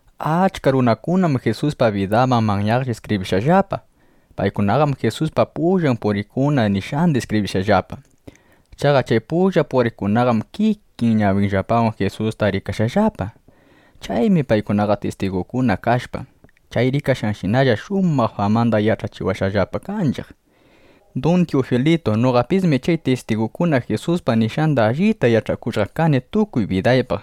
Achka runakunam Jisuspa bidambaq manyaqlla iskibrishqallapa. Paykunaqam Jisuspa pullan puriqkuna nishqanda iskibrishqallapa. Chaqa chay pullan puriqkunaqam kikin ñawinllapawan Jisustaqa rikashqallapa. Chaymi paykunaqa tistigunguna kashpa, chay rikashqanshinalla shumaq famanda yach'achiwashqallapa kanchiq. Dun Tiyufilitu, noqapismi chay tistigukuna Jisuspaq nishqanda allita yach'akushqa kani tukuy bidambaq,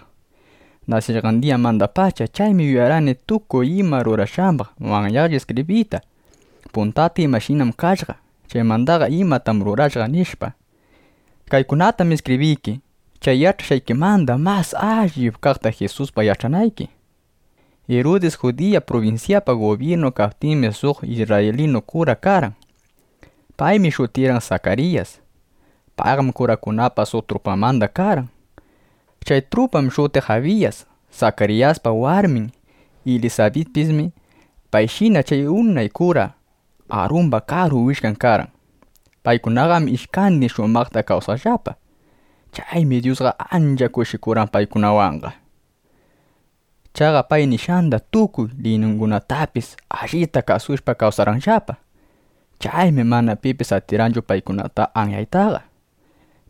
nasishqan diyamandapacha. Chaymi yuyarqani tukuy ima rurashqambaq manyaqlla iskibriyta, puntata imashina kashqa, chaymandaqa imatam rurashqa, nishpa. Kaykunatam iskibriyki, chay yach'ashqaykimanda mas allip kaqta Jisuspaq yach'anayki. Irudis Judiya prubinsyapa gubyirnun kaptinmi, suq isrraylinu kura karqan. Paymi shutirqan Sakariyas. Payqam kurakunapa suq trupanmanda karqan. Chay trupam shutiq Abiyas. Sakariyaspa warmin Ilisabitpismi payshina chay unay kura Arumba karu willkan karqan. Paykunaqam ishkandin shumaqta kawsaqllapa. Chaymi Dyusqa ancha kushikurqan paykunawanqa. Chaqa pay nishqanda, tukuy liyningunatapis allita kasushpam kawsarqanllapa. Chaymi mana pipis atirqanchu paykunata anyaytaqa.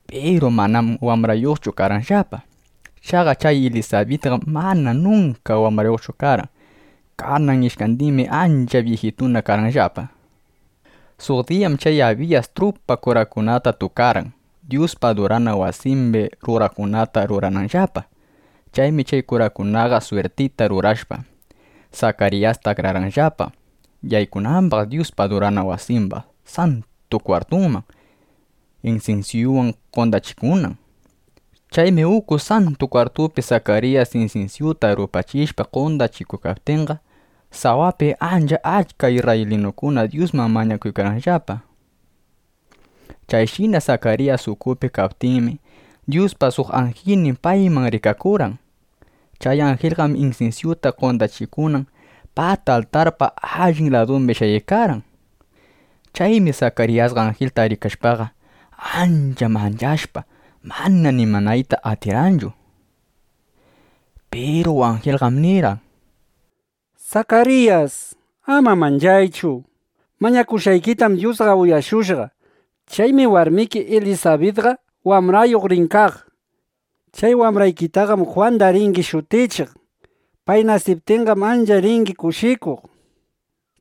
Piru manam wambrayuqchu karqanllapa. Chaqa chay Ilisabitqam mana nunka wambrayuqchu karqan. Kanan ishkandinmi ancha byijitukunana karqanllapa. Suq diyam chay Abiyas trupa kurakunata tukarqan, Dyuspa adurana wasimbi ruranangunata rurananllapa. Chaymi chay kurakunaqa swirtita rurashpa, Sakariyasta akrarqanllapa, yaykunambaq Dyuspa adurana wasimba Santu Kwartunman, insinsyuwan qondachikunan. Chaymi uku Santu Kwartupi Sakariyas insinsyuta rupachishpa qondachiykaptinqa, sawapi ancha achka isrraylinukuna Dyusman mañakuykarqanllapa. Chayshina Sakariyas ukupi kaykaptinmi, Dyuspa suq anjilnin payman rikakurqan. Chay anjilqam insinsyuta qondachikunan pata altarpa allin ladumbi shayaykarqan. Chaymi Sakariyasqa anjilta rikashpaqa, ancha manchashpa, mana nimanayta atirqanchu. Piru anjilqam nirqan: —Sakariyas, ama manchaychu. Mañakushqaykitam Dyusqa uyashushqa. Chaymi warmiki Ilisabitqa wambrayuq rin kaq. Chay wambraykitaqam Jwanda ringi shutichiq. Pay nasiptinqam, ancha ringi kushikuq.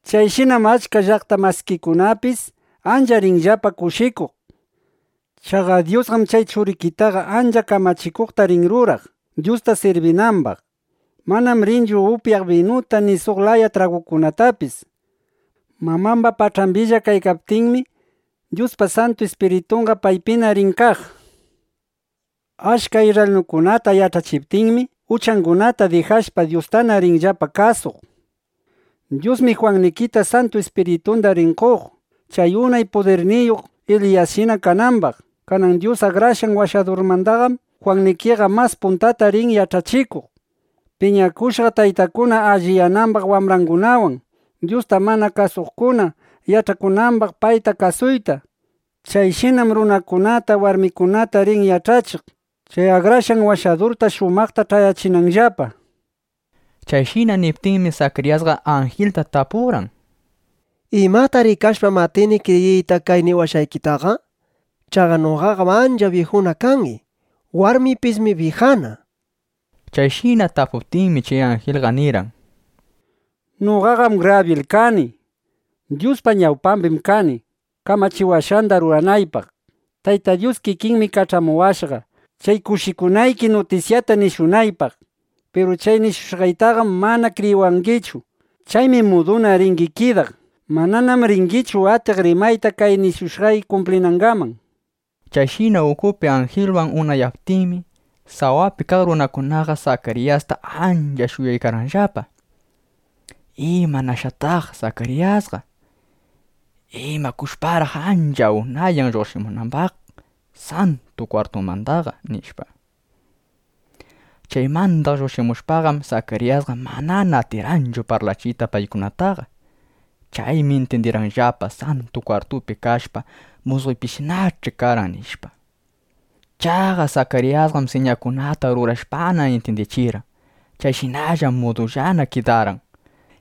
Chayshinam achka llaqta masikikunapis ancha rinllapa kushikuq. Chaqa Dyusqam chay churikitaqa ancha kamachikuqta rin ruraq, Dyusta sirbinambaq. Manam rinchu upyaq binuta ni suq laya tragukunatapis. Mamamba pach'ambilla kaykaptinmi, Dyuspa Santu Ispiritunqa paypina rin kaq. Achka isrraylinukunata yach'achiptinmi, uchangunata dijashpa, Dyustana rinllapa kasuq. Dyusmi Jwannikita Santu Ispiritunda rin qoq, chay unay pudirniyuq Eliyasshina kanambaq. Kanan Dyus Akrashqan Washadurmandaqam Jwannikiqa mas puntata rin yach'achikuq, piñakushqa taytakuna alliyanambaq wambrangunawan, Dyusta mana kasuqkuna yach'akunambaq payta kasuyta. Chayshinam runakunata, warmikunata rin yach'achiq, chay Akrashqan Washadurta shumaqta ch'ayachinanllapa, nishpa. Chayshina niptinmi, Sakariyasqa anjilta tapurqan: —¿Imata rikashpam atini kriyiyta kay niwashqaykitaqa? Chaqa noqaqam ancha byijuna kani. Warmiypismi byijana, nishpa. Chayshina tapuptinmi, chay anjilqa nirqan: —Noqaqam Grabyil kani. Dyuspa ñawpambim kani, kamachiwashqanda ruranaypaq. Tayta Dyus kikinmi kach'amuwashqa, chay kushikunayki nutisyata nishunaypaq. Piru chay nishushqaytaqam mana kriyiwangichu. Chaymi muduna ringi kidaq. Mananam ringichu atiq rimayta, kay nishushqay kumplinangaman, nishpa. Chayshina ukupi anjilwan unayaptinmi, sawapi kaq runakunaqa Sakariyasta ancha shuyaykarqanllapa: ¿Imanashqataq Sakariyasqa? ¿Imakushparaq ancha unayan lluqshimunambaq Santu Kwartumandaqa? nishpa. Chaymanda lluqshimushpaqam, Sakariyasqa manana atirqanchu parlachiyta paykunataqa. Chaymi intyindirqanllapa: Santu Kwartupi kashpa, musqoypishinach'i karqan, nishpa. Chaqa Sakariyasqam siñakunata rurashpana intyindichirqan. Chayshinam mudullana kidarqan.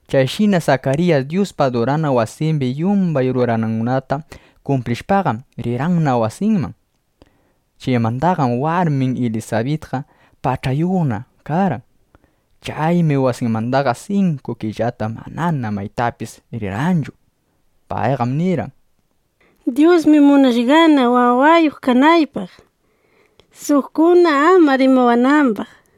Chayshina Sakariyas Dyuspa adurana wasimbi yumbay ruranangunata kumplishpaqam, rirqanna wasinman. Chaymandaqam warmin Ilisabitqa pach'ayuqna (ukuyuqna) karqan. Chaymi wasinmandaqa sinku killata manana maytapis rirqanchu. Payqam nirqan: —Dyusmi munashqana, wawayuq kanaypaq, suqkuna ama rimawanambaq, nishpa.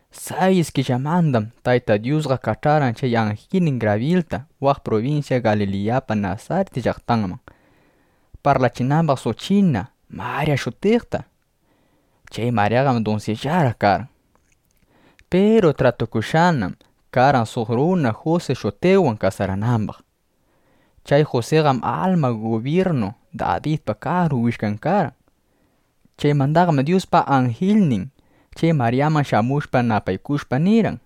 Sayis killamandam Tayta Dyusqa kach'arqan chay anjilnin Grabyilta waq prubinsya Galiliyapa Nasarit llaqtanman, parlachinambaq suq china Marya shutiqta. Chay Maryaqam dunsillaraq karqan. Piru tratukushqanam karqan, suq runa Jusi shutiqwan kasaranambaq. Chay Jusiqam alma gubyirnu Dabidpa karu willkan karqan. Chaymandaqam Dyuspa anjilnin chay Maryaman shamushpa, napaykushpa, nirqan: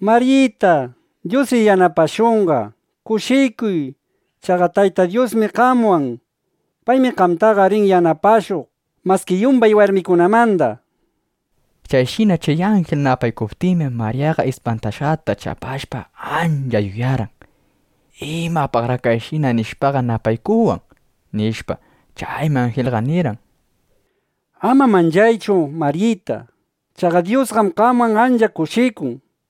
—¡Maryita, Dyusri yanapashunqa! ¡Kushikuy! Chaqa Tayta Dyusmi qamwan. Paymi qamtaqa rin yanapashuq maski yumbay warmikunamanda, nishpa. Chayshina chay anjil napaykuptinmi, Maryaqa ispantashqata chapashpa, ancha yuyarqan: ¿Imapaqraq kayshina nishpaqa napaykuwan? nishpa. Chaymi anjilqa nirqan: —Ama manchaychu, Maryita. Chaqa Dyusqam qamwan ancha kushikun.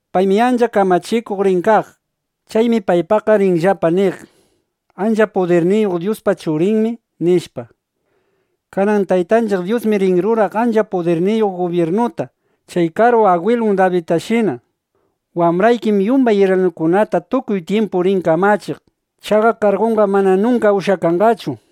Paymi ancha kamachikuq rin kaq. Chaymi paypaqqa rinllapa niq: Ancha pudirniyuq Dyuspa Churinmi, nishpa. Kanan Taytanchiq Dyusmi rin ruraq ancha pudirniyuq gubyirnuta, chay karu agwilun Dabidtashina. Wambraykim yumbay isrraylinukunata tukuy tyimpu rin kamachiq. Chaqa kargunqam mana nunka ushyakanqachu, nishpa.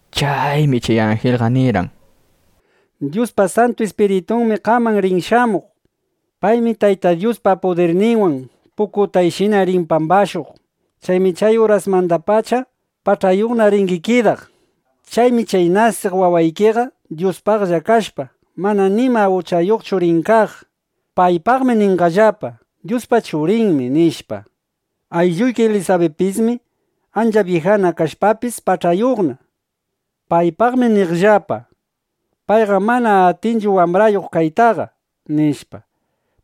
Chaymi chay anjilqa nirqan: —Dyuspa Santu Ispiritunmi qaman rin shamuq. Paymi Tayta Dyuspa pudirninwan pukutayshina rin pambashuq. Chaymi chay urasmandapacha pach'ayuqna (ukuyuqna) ringi kidaq. Chaymi chay nasiq wawaykiqa Dyuspaqlla kashpa, mana nima uchayuqchu rin kaq. Paypaqmi ninqallapa: Dyuspa Churinmi, nishpa. Aylluyki Ilisabitpismi ancha byijana kashpapis, pach'ayuqna (ukuyuqna). Paypaqmi niqllapa: “Payqam mana atinchu wambrayuq kaytaqa” nishpa.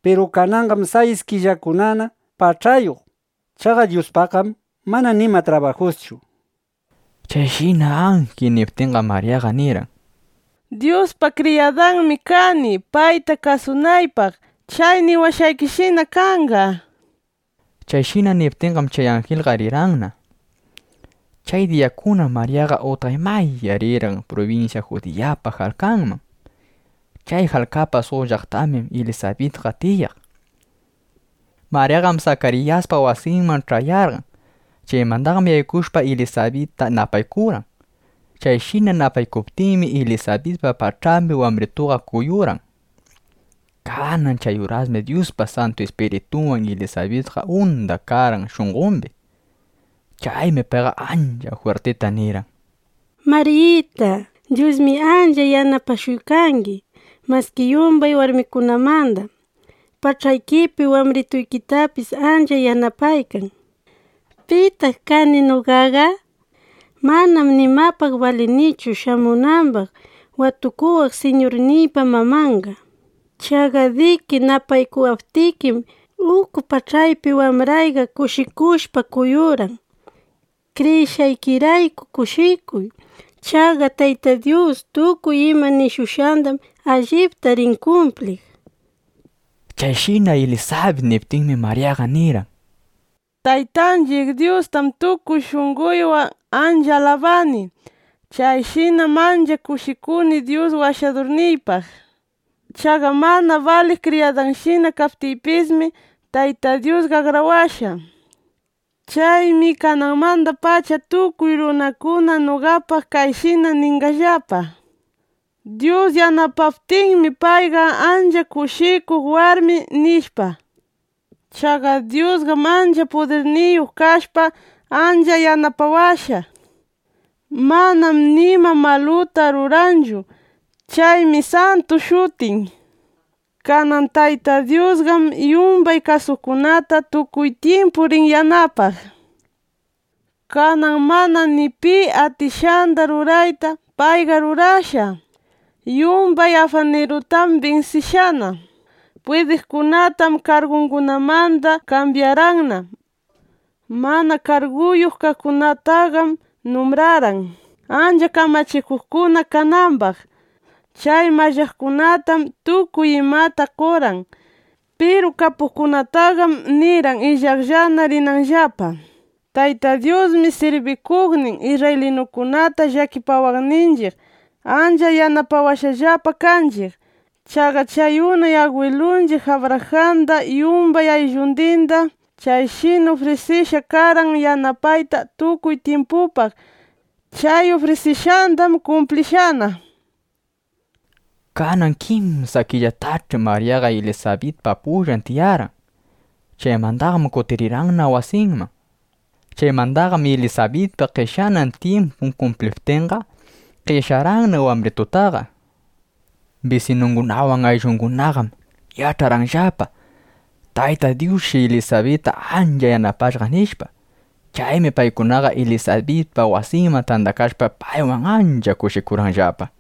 Piru kananqam sayis killakunana pach'ayuq (ukuyuq). Chaqa Dyuspaqqam mana nima trabajuschu, nishpa. Chayshina anjil niptinqam, Maryaqa nirqan: —Dyuspa kriyadanmi kani, payta kasunaypaq. Chay niwashqaykishina kanqa, nishpa. Chayshina niptinqam, chay anjilqa rirqanna. Chay diyakunam Maryaqa utqaymaya rirqan prubinsya Judiyapa jalkanman. Chay jalkapa suq llaqtambim Ilisabitqa tiyaq. Maryaqam Sakariyaspa wasinman ch'ayarqan. Chaymandaqam yaykushpa, Ilisabitta napaykurqan. Chayshina napaykuptinmi, Ilisabitpa pach'ambi wambritunqa kuyurqan. Kanan chay urasmi Dyuspa Santu Ispiritunwan Ilisabitqa unda karqan shunqombi. Chaymi payqa ancha jwirtita nirqan: —Maryita, Dyusmi ancha yanapashuykangi maski yumbay warmikunamanda. Pach'aykipi wambrituykitapis ancha yanapaykan. ¿Pitaq kani noqaqa? Manam nimapaq balinichu shamunambaq watukuwaq Siñurniypa mamanqa. Chaqa diki napaykuwaptikim, uku pach'aypi wambrayqa kushikushpa kuyurqan. Kriyishqaykirayku kushikuy. Chaqa Tayta Dyus tukuy ima nishushqandam allipta rin kumpliq, nishpa. Chayshina Ilisabit niptinmi, Maryaqa nirqan: Taytanchiq Dyustam tukuy shunqoywan ancha alabani. Chayshinam ancha kushikuni Dyus Washadurniypaq. Chaqa mana baliq kriyadanshina kaptiypismi, Tayta Dyusqa akrawashqa. Chaymi kananmandapacha tukuy runakuna noqapaq kayshina ninqallapa: “Dyus yanapaptinmi, payqa ancha kushikuq warmi”, nishpa. Chaqa Dyusqam ancha pudirniyuq kashpa, ancha yanapawashqa. Manam nima maluta ruranchu. Chaymi Santu shutin. Kanan Tayta Dyusqam yumbay kasuqkunata tukuy tyimpu rin yanapaq. Kanan mana ni pi atishqanda ruraytam payqa rurashqa. Yumbay afanirutam binsishqana. Pwidiqkunatam kargungunamanda kambyarqanna. Mana karguyuq kaqkunataqam numbrarqan, ancha kamachikuqkuna kanambaq. Chay mallaqkunatam tukuy imata qorqan. Piru kapuqkunataqam nirqan illaqllana rinanllapa. Tayta Dyusmi sirbikuqnin isrraylinukunata llakipawaqninchiq, ancha yanapawashqallapa kanchiq. Chaqa chay unay agwilunchiq Abrajanda yumbay ayllundinda chayshina ufrishqa karqan yanapayta tukuy tyimpupaq. Chay ufrisishqandam kumplishqana, nishpa. Kanan kimsa killatach'i Maryaqa Ilisabitpa pullan tiyarqan. Chaymandaqam kutirqanna wasinman. Chaymandaqam Ilisabitpa qeshyanan tyimpun kumpliptinqa, qeshyarqanna wambritundaqa. Bisinungunawan ayllungunaqam yach'arqanllapa: Tayta Dyusshi Ilisabitta ancha yanapashqa, nishpa. Chaymi paykunaqa Ilisabitpa wasinman tandakashpa, paywan ancha kushikurqanllapa.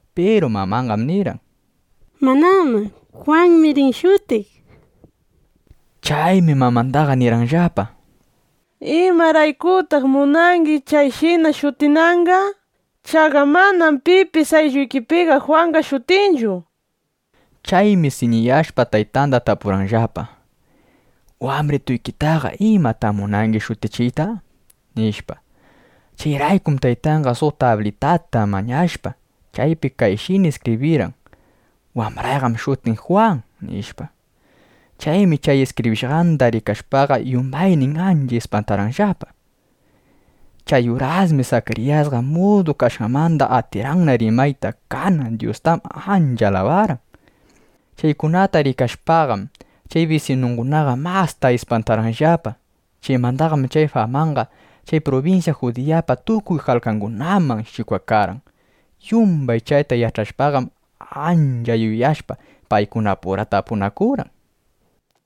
Piru mamanqam nirqan: —¡Manám! Jwanmi rin shutiq, nishpa. Chaymi mamandaqa nirqanllapa: —¿Imaraykutaq munangi chayshina shutinanqa? Chaqa manam pipis aylluykipiqa Jwanqa shutinchu, nishpa. Chaymi siñiyashpa, taytanda tapurqanllapa: —¿Wambrituykitaqa imatam munangi shutichiyta? nishpa. Chayraykum taytanqa suq tablitata mañashpa, chaypi kayshina iskibrirqan: “Wambrayqam shutin Jwan”, nishpa. Chaymi chay iskibrishqanda rikashpaqa, yumbaynin ancha ispantarqanllapa. Chay urasmi Sakariyasqa mudu kashqanmanda, atirqanna rimayta. Kanan Dyustam ancha alabarqan. Chaykunata rikashpaqam, chay bisinungunaqa masta ispantarqanllapa. Chaymandaqam chay famaqa chay prubinsya Judiyapa tukuy jalkangunaman shikwakarqan. Yumbay chayta yach'ashpaqam, ancha yuyashpa, paykunapura tapunakurqan: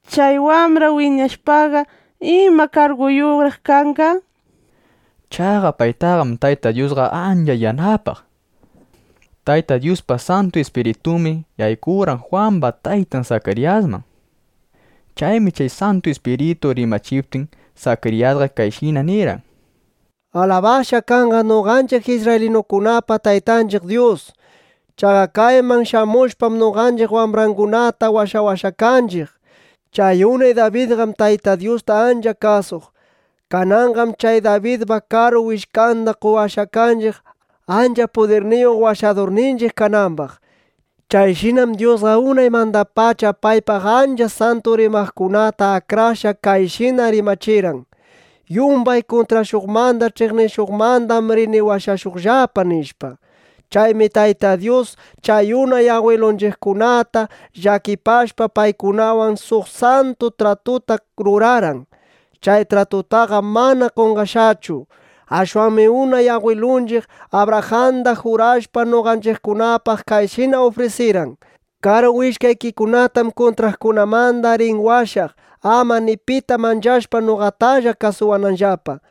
—Chay wambra wiñashpaqa ¿ima karguyuqraq kanqa? nishpa. Chaqa paytaqam Tayta Dyusqa ancha yanapaq. Tayta Dyuspa Santu Ispiritunmi yaykurqan Jwamba taytan Sakariyasman. Chaymi chay Santu Ispiritu rimachiptin, Sakariyasqa kayshina nirqan: ¡Alabashqa kanqa noqanchiq isrraylinukunapa Taytanchiq Dyus! Chaqa kayman shamushpam, noqanchiq wambrangunata washawashqa kanchiq. Chay unay Dabidqam Tayta Dyusta ancha kasuq. Kananqam chay Dabidpa karu willkanda qowashqa kanchiq, ancha pudirniyuq Washadurninchiq kanambaq. Chayshinam Dyusqa unaymandapacha paypaq ancha santu rimaqkunata akrashpa, kayshina rimachirqan: “Yumbay kuntrashuqmanda, ch'iqnishuqmandam rini washashuqllapa”, nishpa. Chaymi Tayta Dyus chay unay agwilunchiqkunata llakipashpa, paykunawan suq santu tratuta rurarqan. Chay tratutaqam mana qonqashqachu. Ashwanmi unay agwilunchiq Abrajanda jurashpa, noqanchiqkunapaq kayshina ufrisirqan: “Karu willkaykikunatam kuntraqkunamanda rini washaq, ama ni pita manchashpa noqatalla kasuwananllapa,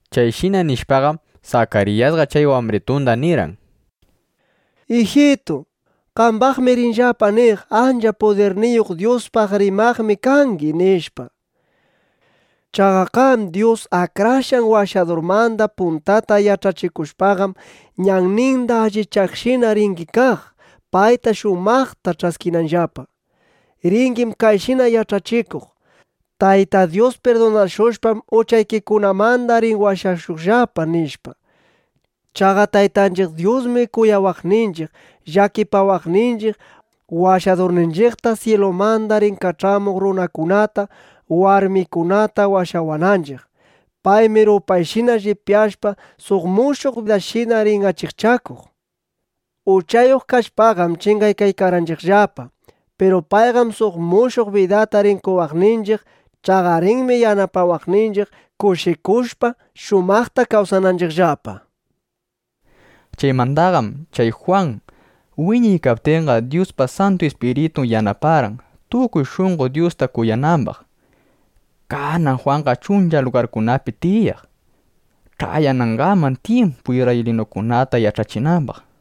Chayshina nishpaqam, Sakariyasqa chay wambritunda nirqan: Ijitu, qambaqmi rinllapa niq: “Ancha pudirniyuq Dyuspaq rimaqmi kangi” nishpa. Chaqa qam Dyus Akrashqan Washadurmanda puntata yach'achikushpaqam, ñanninda allichaqshina ringi kaq, payta shumaqta ch'ayachinanllapa. Ringim kayshina yach'achikuq: “Tayta Dyus pirdunashushpam, uchaykikunamanda rin washashuqllapa”, nishpa. Chaqa Taytanchiq Dyusmi kuyawaqninchiq, llakipawaqninchiq, Washadurninchiqta syilumanda rin kach'amuq runakunata, warmikunata washawananchiq. Paymi rupayshina llipyashpa, suq mushuq diyashina rin achikchakuq. Uchayuq kashpaqam chingaykarqanchiqllapa. Piru payqam suq mushuq bidata rin qowaqninchiq. Chaqa rinmi yanapawaqninchiq, kushikushpa, shumaqta kawsananchiqllapa, nishpa. Chaymandaqam chay Jwan wiñaykaptinqa, Dyuspa Santu Ispiritun yanaparqan, tukuy shunqo Dyusta kuyanambaq. Kanan Jwanqam chuncha lugarkunapi tiyaq, ch'ayanangaman tyimpu isrraylinukunata yach'achinambaq.